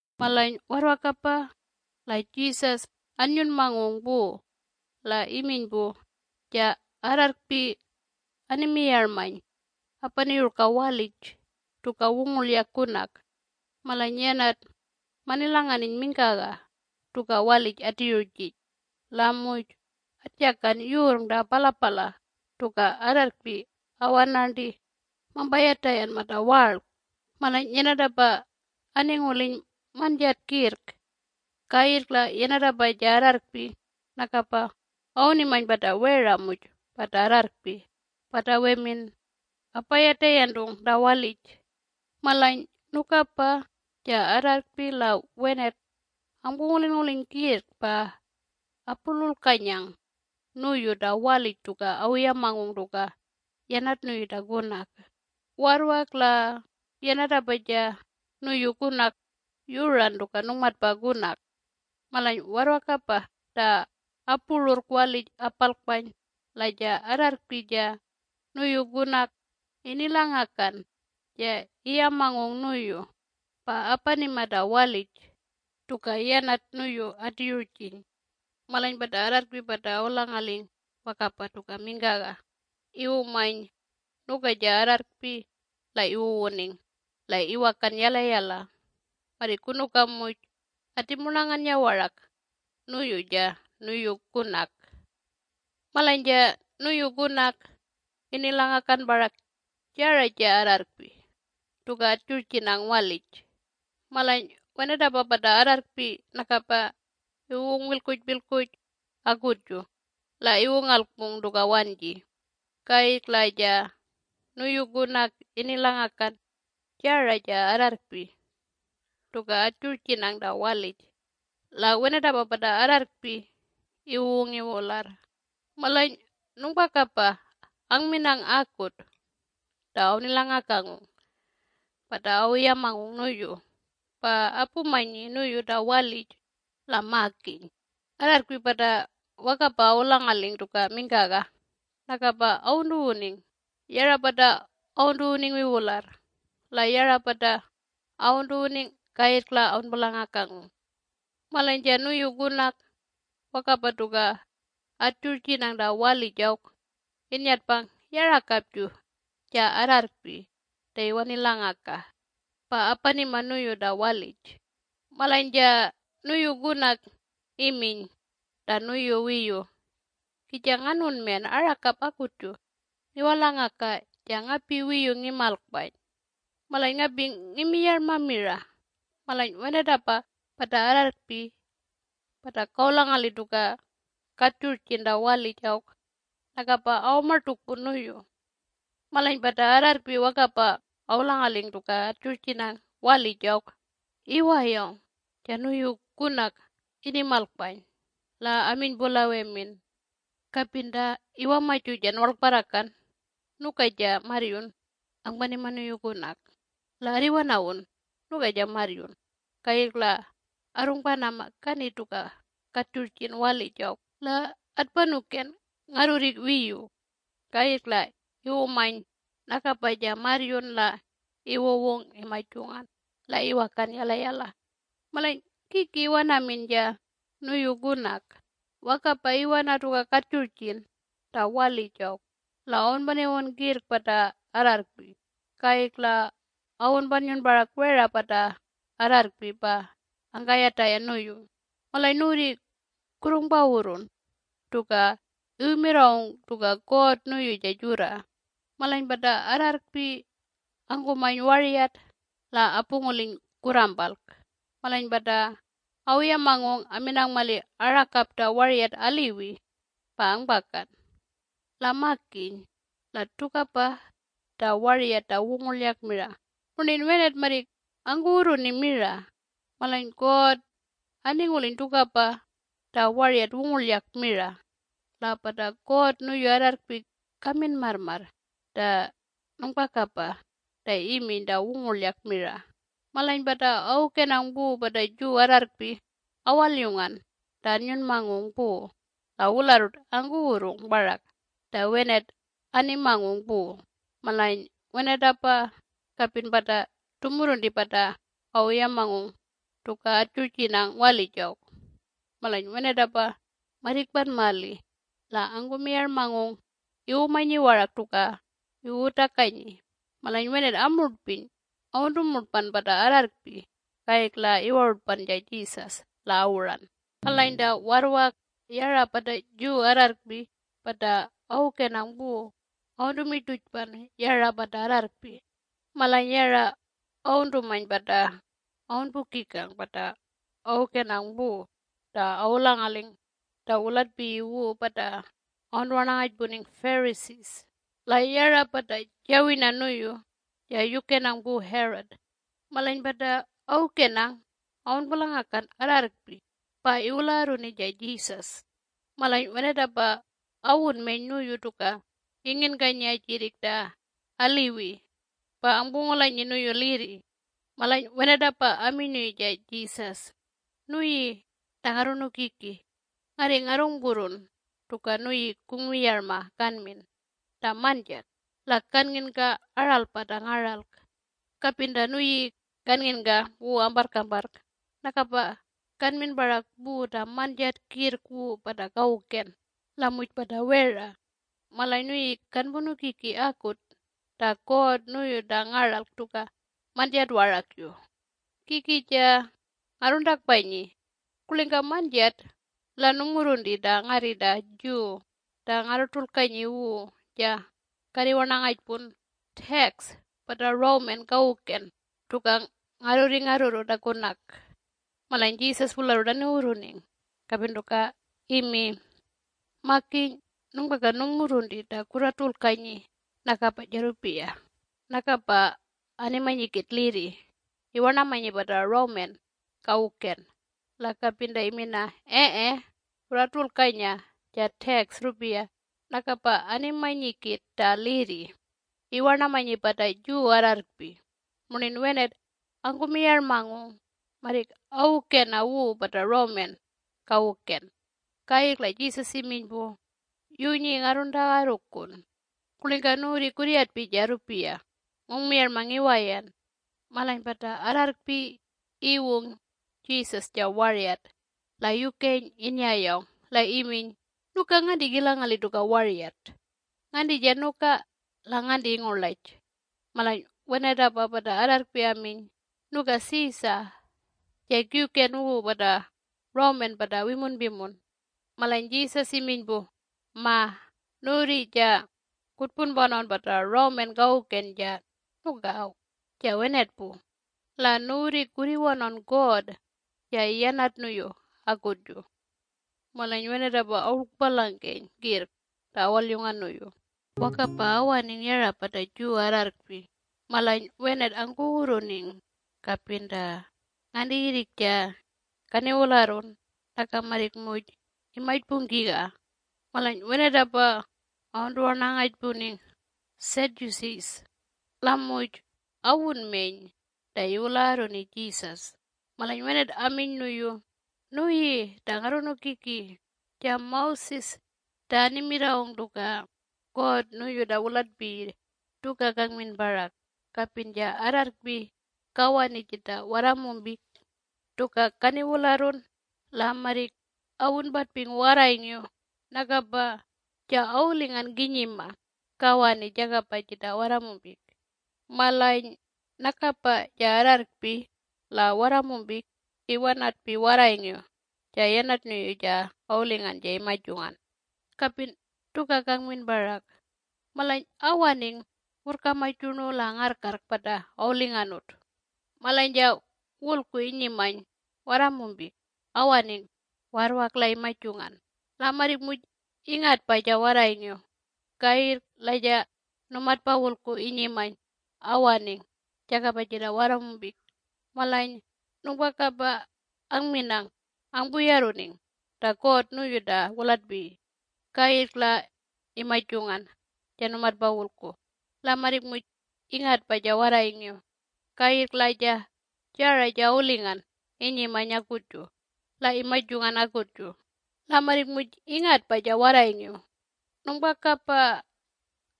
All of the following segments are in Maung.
Malany warrwakapa la Jesus annyunmangung pu la iminy pu, “Ja arrarrkpi animiyarmany apaniyurka walij tuka wungurlyak kunak. Malany yanat manilanganiny mingkaga tuka walij atiyurjiny la muj atjakan yurrng ta palapala tuka arrarrkpi awanarnti mampayatayan mata warlk. Malany yanatapa aninguliny manjat kirrk. Kayirrk la yanatapa ja arrarrkpi nakapa awunimany pata wera muj pata arrarrkpi pata wemin apayatayantung ta walij. Malany nukapa ja arrarrkpi la wenat angpungulinnguliny kirrk pa apululkanyang nuyu ta walij tuka awuyamangung tuka yanat nuyu ta kunak. Warrwak la yanatapa ja nuyu kunak yuran tuka nungmatpa kunak. Malany warrwakapa ta apururrk walij apalkpany la ja arrarrkpi ja nuyu kunak inilangakan ja iyamangung nuyu pa apanima ta walij tuka yanat nuyu atiyurjiny. Malany pata arrarrkpi pata awulangaling wakapa tuka mingkaga iwumany nuka ja arrarrkpi la iwuwuning la iwakan yalayala marrik kunuka muj atimurnanganya warak nuyu ja nuyu kunak. Malany ja nuyu kunak inilangakan parak jara ja arrarrkpi tuka atjurjinang walij. Malany wenatapa pata arrarrkpi nakapa iwuwung wilkpujpilkpuj akutju la iwungalkpung tuka wanji. Kayirrk la ja nuyu kunak inilangakan jara ja arrarrkpi tuka atjurjinang ta walij la wenatapa pata arrarrkpi iwuwung iwularr. Malany nungpakapa angminang akut ta awunilangakangung pata awuyamangung nuyu pa apumanyi nuyu ta walij la makiny, arrarrkpi pata wakapa awulangaling tuka mingkaga nakapa awuntuwuning yara pata awuntuwuning wiwularr la yara pata awuntuwuning kayirrk la awunpulangakangung. Malany ja nuyu kunak wakapa tuka atjurjinang ta walij awk innyatpang yarakapju ja arrarrkpi ta iwanilangaka pa apanima nuyu ta walij. Malany ja nuyu kunak iminy ta nuyu wiyu, ‘Kija nganunmen arakap akutju ngiwalangaka ja ngapi wiyu ngimalkpany. Malany ngapi ngimiyarma mira malany wenatapa pata arrarrkpi pata kawulangali tuka katjurjin ta walij awk nakapa awamartukpun nuyu.’ Malany pata arrarrkpi wakapa awulangaling tuka atjurjinang walij awk iwayawng ja nuyu kunak inimalkpany la aminy pu la wemin, ‘Kapin ta iwamaju ja nuwarlkparrakan nuka ja marryun angpanima nuyu kunak. La arriwanawun nuka ja marryun kayirrk la arrungpanama kani tuka katjurjin walij awk la atpanuken ngarrurri wiyu.’ Kayirrk la iwumany nakapa ja marryun la iwuwung imajungan la iwakan yalayala. Malany kiki iwanamin ja nuyu kunak? Wakapa iwana tuka katjurjin ta walij awk la awunpaniwun kirrk pata arrarrkpi. Kayirrk la awunpannyun parak wera pata arrarrkpi pa angkayatayan nuyu. Malany nuwurri kurrungpawurrun tuka iwumirrawung tuka God nuyu ja jurra: ‘Malany pata arrarrkpi angkumany waryat la apunguliny kurrampalk. Malany pata awuyamangung aminang mali arakap ta waryat aliwi pa angpakan. La makiny! La tukapa ta waryat ta wungurlyak mira murnin wenat marrik angkuwurruni mira. Malany God aninguliny tukapa ta waryat wungurlyak mira. La pata God nuyu arrarrkpi kamin marrmarr ta nungpakapa ta iminy ta wunguryak mira.’” Malany pata awukenang pu pata Jew arrarrkpi awalyungan ta annyunmangung pu la wularrut angkuwurrung parak ta wenat animangung pu - malany wenatapa kapin pata tumurrunti pata awuyamangung tuka atjurjinang walij awk. Malany wenatapa marrikpan mali la angkumiyarmangung iwumanyi warak tuka iwuwutakanyi. Malany wenat amurtpiny awuntumurtpan pata arrarrkpi kayirrk la iwarutpan ja Jesus la awuran. Malany ta warrwak yara pata Jew arrarrkpi pata awukenang pu awuntumirtujpan yara pata arrarrkpi. Malany yara awuntumany pata awunpukikang pata awukenang pu ta awulangaling ta wulatpiyi wu pata awuntuwarnangajpuning Pharisees la yara pata jawirna nuyu ja yukenang pu Herod. Malany pata awukenang awunpulangakan arrarrkpi pa iwulagarruni ja Jesus. Malany wenatapa awunmeny nuyu tuka inginkanyi ajirrik ta aliwi, pa angpungulanyi nuyu lirri. Malany wenatapa aminy nuyu ja Jesus, “Nuyi ta Ngarrunukiki, ngarri ngarrungpurrun tuka nuyi kungmiyarma kanmin ta manjat la kannginka aralpa ta ngaralk. Kapin ta nuyi kannginka wu amparrkamparrk nakapa kanmin parak pu ta manjat kirrk wu pata kawuken la muj pata wera. Malany nuyi kanpunukiki akut ta God nuyu ta ngaralk tuka manjat warakju. Kiki ja ngarruntakpanyi: ‘Kurlingka manjat la nungmurrunti ta ngarri ta Jew ta ngarratulkanyi wu ja karriwarnangajpun tax pata Roman kawuken tuka ngarrurri ngarrurru ta kunak?’” Malany Jesus wularrut aniwurruning kapin tuka imi, “Makiny nungpaka nungmurrunti ta kurratulkanyi nakapa ja rrupiya” nakapa animanyi kit lirri iwarnamanyi pata Roman kawuken la kapin ta imina “Ee kurratulkanya ja tax rrupiya” nakapa animanyi kit ta lirri iwarnamanyi pata Jew arrarrkpi - murnin wenat angkumiyarmangung marrik awukena wu pata Roman kawuken. Kayirrk la Jesus iminy pu, “Yunyi ngarruntagarrukun. Kurlingka nuwurri kurryatpi ja rrupiya? Ngungmiyarma ngiwayan.” Malany pata arrarrkpi iwung Jesus ja waryat la yukeny innyayawng la iminy, “Nuka nganti kilangali tuka waryat? Nganti ja nuka la nganti ingurlaj?” Malany wenatapa pata arrarrkpi aminy, “Nuka Caesar - ja kiwken wu pata Roman pata wimunpimun.” Malany Jesus iminy pu, “Ma, nuwurri ja kutpunpanawn pata Roman kawuken ja nuka awk ja wenat pu, la nuwurri kurriwanawn God ja yanat nuyu akutju.” Malany wenatapa awurlkpalangkeny kirrk ta awalyungan nuyu. Wakapa awaning yara pata Jew arrarrkpi malany wenat angkuwurruning kapin ta ngantiyirrik ja kaniwularrun naka marrik muj imajpungkiga. Malany wenatapa awuntuwarnangajpuning ‘Sadducees’. La muj awunmeny ta iwulagarruni Jesus. Malany wenat aminy nuyu, “Nuyi ta Ngarrunukiki, ja Moses ta animirrawung tuka God nuyu ta wulatpiyi tuka kangmin parak: Kapin ja arrarrkpi kawani jita warramumpik tuka kaniwularrun la marrik awunpatping warrayngiw nakapa ja awulingan kinyima kawani jakapa jita warramumpik. Malany nakapa ja arrarrkpi la warramumpik iwanatpi warrayngiw ja yanat nuyu ja awulingan ja imajungan. Kapin tuka kangmin parak. Malany awaning wurrkamaj yurnu la ngarrkarrk pata awulinganut. Malany ja wulku inyimany warramumpik awaning warrwak la imajungan la marrik muj ingatpa ja warrayngiw. Kayirrk la ja numatpa wulku inyimany awaning jakapa jita warramumpik malany nungpakapa aminang angpuyarruning ta God nuyu ta wulatpiyi. Kayirrk la imajungan ja numatpa wulku la marrik muj ingatpa ja warrayngiw. Kayirrk la ja jara ja awulingan inyimany akutju la imajungan akutju la marrik muj ingatpa ja warrayngiw. Nungpakapa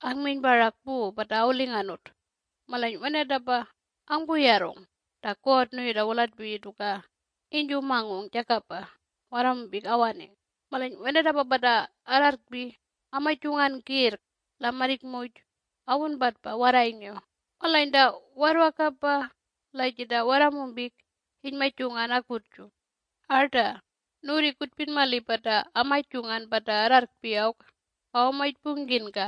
angminy parak pu pata awulinganut. Malany wenatapa angpuyarrung ta God nuyu ta wulatpiyi tuka inyjumangung jakapa warramumpik awaning. Malany wenatapa pata arrarrkpi amajungan kirrk la marrik muj awunpatpa warrayngiw. Malany ta warrwakapa la jita warramumpik inymajungan akutju. Arta! Nuwurri kutpin mali pata amajungan pata arrarrkpi awk awamajpungkinka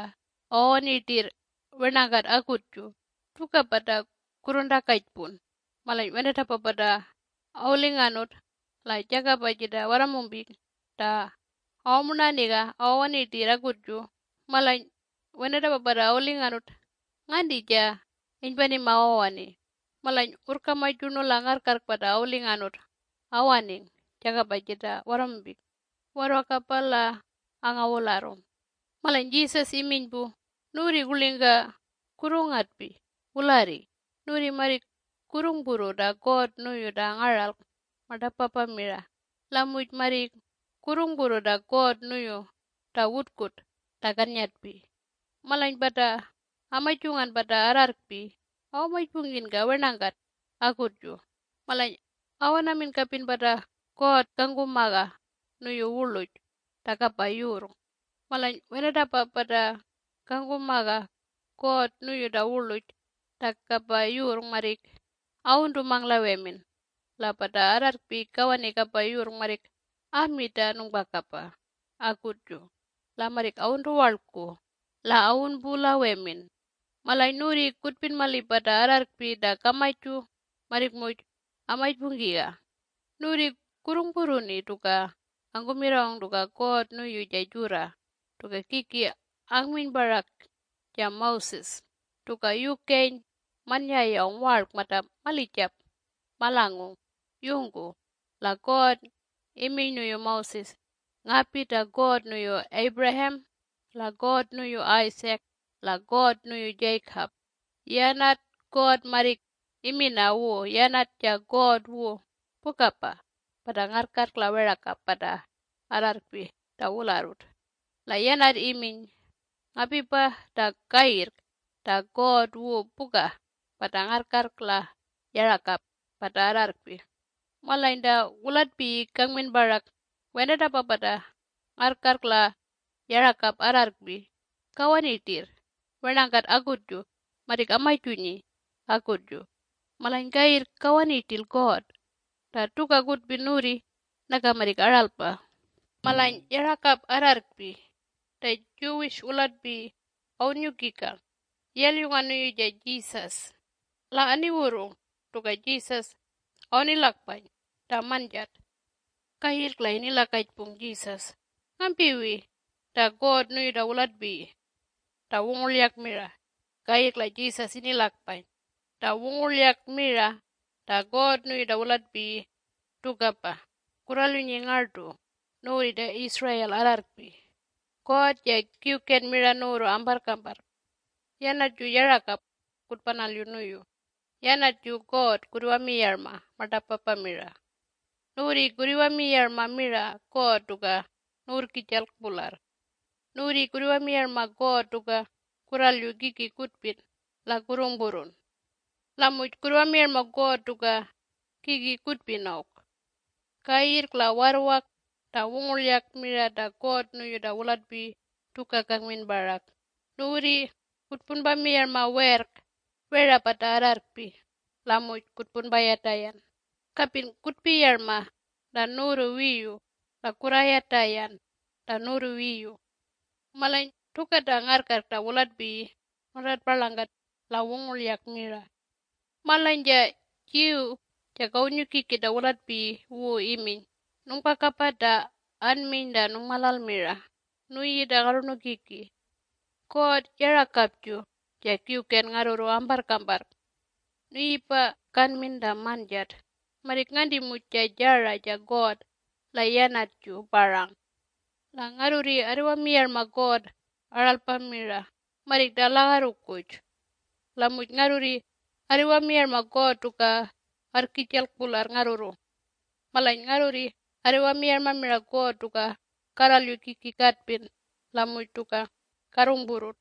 awawani rtirr wernangkat akutju, tukapa ta kurruntakajpun: malany wenatapa pata awulinganut la jakapa jita warramumpik ta awamurnanganiga awawani rtirr akutju, malany wenatapa pata awulinganut nganti ja inypanima awawani? Malany wurrkamaj yurnu la ngarrkarrk pata awulinganut awaning jakapa jita warramumpik warrwakapa la angawularrung.” Malany Jesus iminy pu, “Nuwurri kurlingka kurrungatpi wularri? Nuwurri marrik kurrungpurru ta God nuyu ta ngaralk martapapa mira la muj marrik kurrungpurru ta God nuyu ta wutkut ta kannyatpi. Malany pata amajungan pata arrarrkpi awamajpungkinka wernakat akutju malany awanamin kapin pata God kangkumaga nuyu wurluj ta kapa yurrng. Malany wenatapa pata kangkumaga God nuyu ta wurluj ta kapa yurrng marrik awuntumang la wemin. La pata arrarrkpi kawani kapa yurrng marrik ami ta nungpakapa akutju. La marrik awuntuwarlku la awunpu la wemin. Malany nuwurri kutpin mali pata arrarrkpi ta kamaju marrik muj amajpungkiga. Nuwurri kurrungpurruni tuka angkumirrawung tuka God nuyu ja jurra tuka kiki angminy parak ja Moses - tuka yukeny mannyayawng warlk mata malijap malangung yungku la God iminy nuyu Moses, ‘Ngapi ta God nuyu Abraham la God nuyu Isaac la God nuyu Jacob.’ Yanat God marrik imina wu yanat ja God wu pukapa pata ngarrkarrk la werakap pata arrarrkpi ta wularrut. La yanat iminy ngapipa ta kayirrk ta God wu puka pata ngarrkarrk la yarakap pata arrarrkpi. Malany ta wulatpiyi kangmin parak wenatapa pata ngarrkarrk la yarakap arrarrkpi kawani rtirr wernakat akutju marrik amajunyi akutju. Malany kayirrk kawani rtil God. Ta tuka kutpin nuwurri naka marrik aralpa.” Malany yarakap arrarrkpi ta Jew wulatpiyi awunnyukikang yalyungan nuyu ja Jesus la aniwurrung tuka Jesus awunilakpany ta manjat. Kayirrk la inilakajpung Jesus, “Ngampiwi ta God nuyu ta wulatpiyi ta wungurlyak mira?” Kayirrk la Jesus inilakpany, “Ta wungurlyak mira ta God nuyu ta wulatpiyi tukapa: ‘Kurralyunyi ngartu nuwurri ta Israel arrarrkpi, God ja kiwken mira nuwurru amparrkamparr. Yanatju yarakap kutpanalyu nuyu Yanatju God kurriwamiyarma martapapa mira. Nuwurri kurriwamiyarma mira God tuka nuwurrijalk pularr. Nuwurri kurriwamiyarma God tuka kurralyu kiki kutpin la kurrungpurrun. La muj kurriwamiyarma God tuka kiki kutpin awk.’ Kayirrk la warrwak ta wungurlyak mira ta God nuyu ta wulatpiyi tuka kangmin parak: ‘Nuwurri kutpunpamiyarma werrk wera pata arrarrkpi la muj kutpunpayatayan kapin kutpiyarma ta nuwurru wiyu la kurrayatayan ta nuwurru wiyu.’ Malany tuka ta ngarrkarrk ta wulatpiyi nuntatparlangkat la wungurlyak mira.” Malany ja Jew ja kawunnyukiki ta wulatpiyi wu iminy, “Nungpakapa ta anminy ta nungmalal mira, nuyi ta Ngarrunukiki! God yarakapju ja kiwken ngarrurru amparrkamparrk. Nuyipa kanmin ta manjat, ‘Marrik nganti muj ja jara ja god la Yanatju parang!’ La ngarrurri arriwamiyarma God aralpa mira, marrik ta lagarrukuj. La muj ngarrurri arriwamiyarma God tuka arrkijalk pularr ngarrurru. Malany ngarrurri arriwamiyarma mira God tuka karralyu kiki katpin la muj tuka karrungpurrun.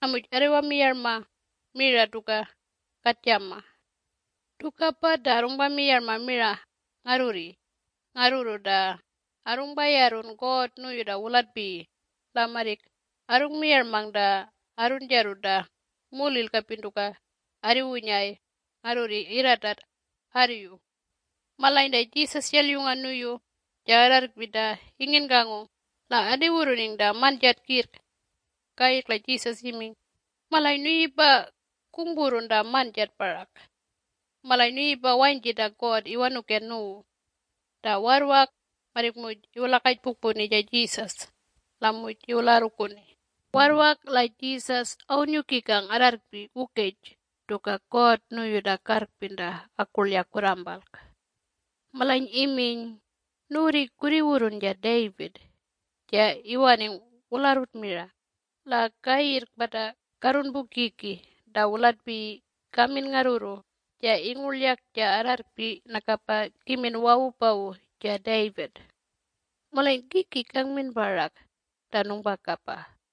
La muj arriwamiyarma mira tuka katjama. Tukapa ta arrungpamiyarma mira ngarrurri ngarrurru ta arrungpayarrun God nuyu ta wulatpiyi la marrik arrungmiyarmang ta arrunjarru ta mulil kapin tuka arriwunyay ngarrurri irratat arriyu.” Malany ta Jesus yalyungan nuyu ja arrarrkpi ta inginkangung la aniwurruning ta manjat kirrk. Kayirrk la Jesus iminy, “Malany nuyipa kungpurrun ta manjat parak. Malany nuyipa wanyji ta God iwanuken nuwu.” Ta warrwak marrik muj iwulakajpukpuni ja Jesus la muj iwulagarruni. Warrwak la Jesus awunnyukikang arrarrkpi wukej tuka God nuyu ta karrpin mira ta akurlyak kurrampalk. Malany iminy, “Nuwurri kurriwurrun ja David ja iwaning wularrut mira, la kayirrk pata karrunpukiki ta wulatpiyi kamin ngarrurru ja ingurlyak ja arrarrkpi nakapa kimin wawupawu ja David. Malany kiki kangmin parak ta nungpakapa?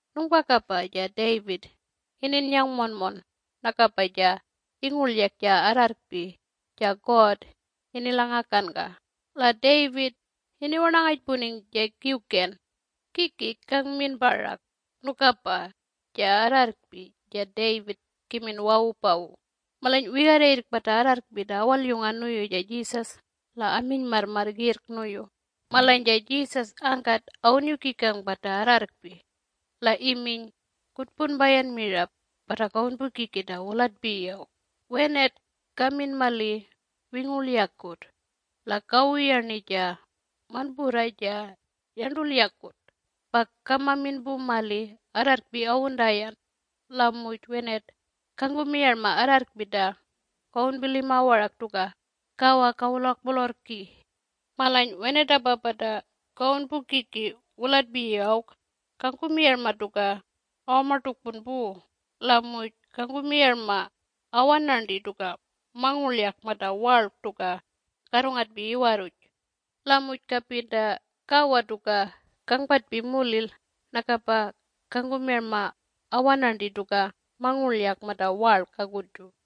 Nungpakapa ja David ininnyang monmon nakapa ja ingurlyak ja arrarrkpi ja God inilangakanka, la David iniwarnangajpuning ja Kiwken. Kiki kangmin parak nukapa ja arrarrkpi ja David kimin wawupawu?” Malany wigarra yirrk pata arrarrkpi ta awalyungan nuyu ja Jesus la aminy marrmarr kirrk nuyu. Malany ja Jesus angkat awunnyukikang pata arrarrkpi. La iminy, “Kutpunpayan mira pata kawunpukiki ta wulatpiyi awk. Wenat kamin mali wingurlyakut. La kawuyarni ja manpurrwa ja yarntulyakut pa kamamin pu mali arrarrkpi awuntayan. La muj wenat kangkumiyarma arrarrkpi ta kawunpilima warak tuka kawa kawulakpolorrki. Malany wenatapa pata kawunpukiki wulatpiyi awk kangkumiyarma tuka awamartukpun pu la muj kangkumiyarma awanarnti tuka mangurlyak mata warlk tuka karrungatpi iwarruj. La muj kapin ta kawa tuka kangpatpi mulil nakapa kangkumiyarma awanarnti tuka mangulyak mata warlk akutju.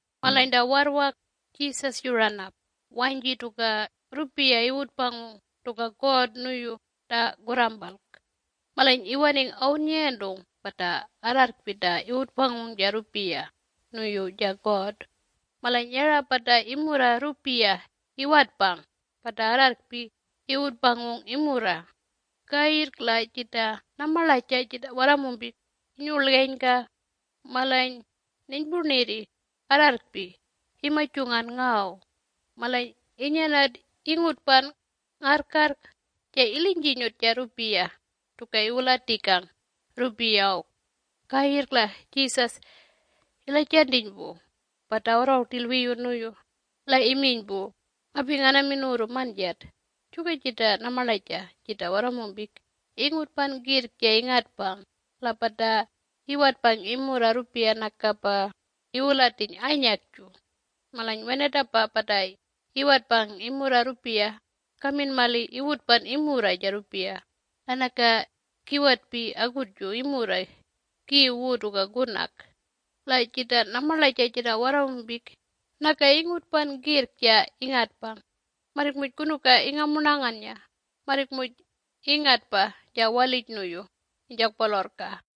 Malany ta warrwak Jesus yuran ap wanyji tuka rrupiya iwutpangung tuka God nuyu ta kurrampalk. Malany iwaning awunnyayantung pata arrarrkpi ta iwutpangung ja rrupiya nuyu ja God. Malany yara pata imurra rrupiya iwatpang pata arrarrkpi iwutpangung imurra. Kayirrk la jita namarlaja jita warramumpik inyurlgenyka. Malany ninypurnirri arrarrkpi imajungan ngaw. Malany inyanat ingutpan ngarrkarrk ja ilinyjinyut ja rrupiya tuka iwulatikang rrupiya awk. Kayirrk la Jesus ilajantiny pu pata awarrangung rtil wiyu nuyu la iminy pu, “Ngapi nganamin nuwurru manjat: juka jita namarlaja jita warramumpik ingutpan kirrk ja ingatpang la pata iwatpang imurra rrupiya nakapa iwulatiny anyakju. Malany wenatapa pata iwatpang imurra rrupiya kamin mali iwutpan imurra ja rrupiya, la naka kiwatpi akutju imurra kiw wu tuka kunak. La jita namarlaja jita warramumpik naka ingutpan kirrk ja ingatpang. Marrik muj kunuka ingamurnanganya, marrik muj ingatpa ja walij nuyu inyjakpolorrka.”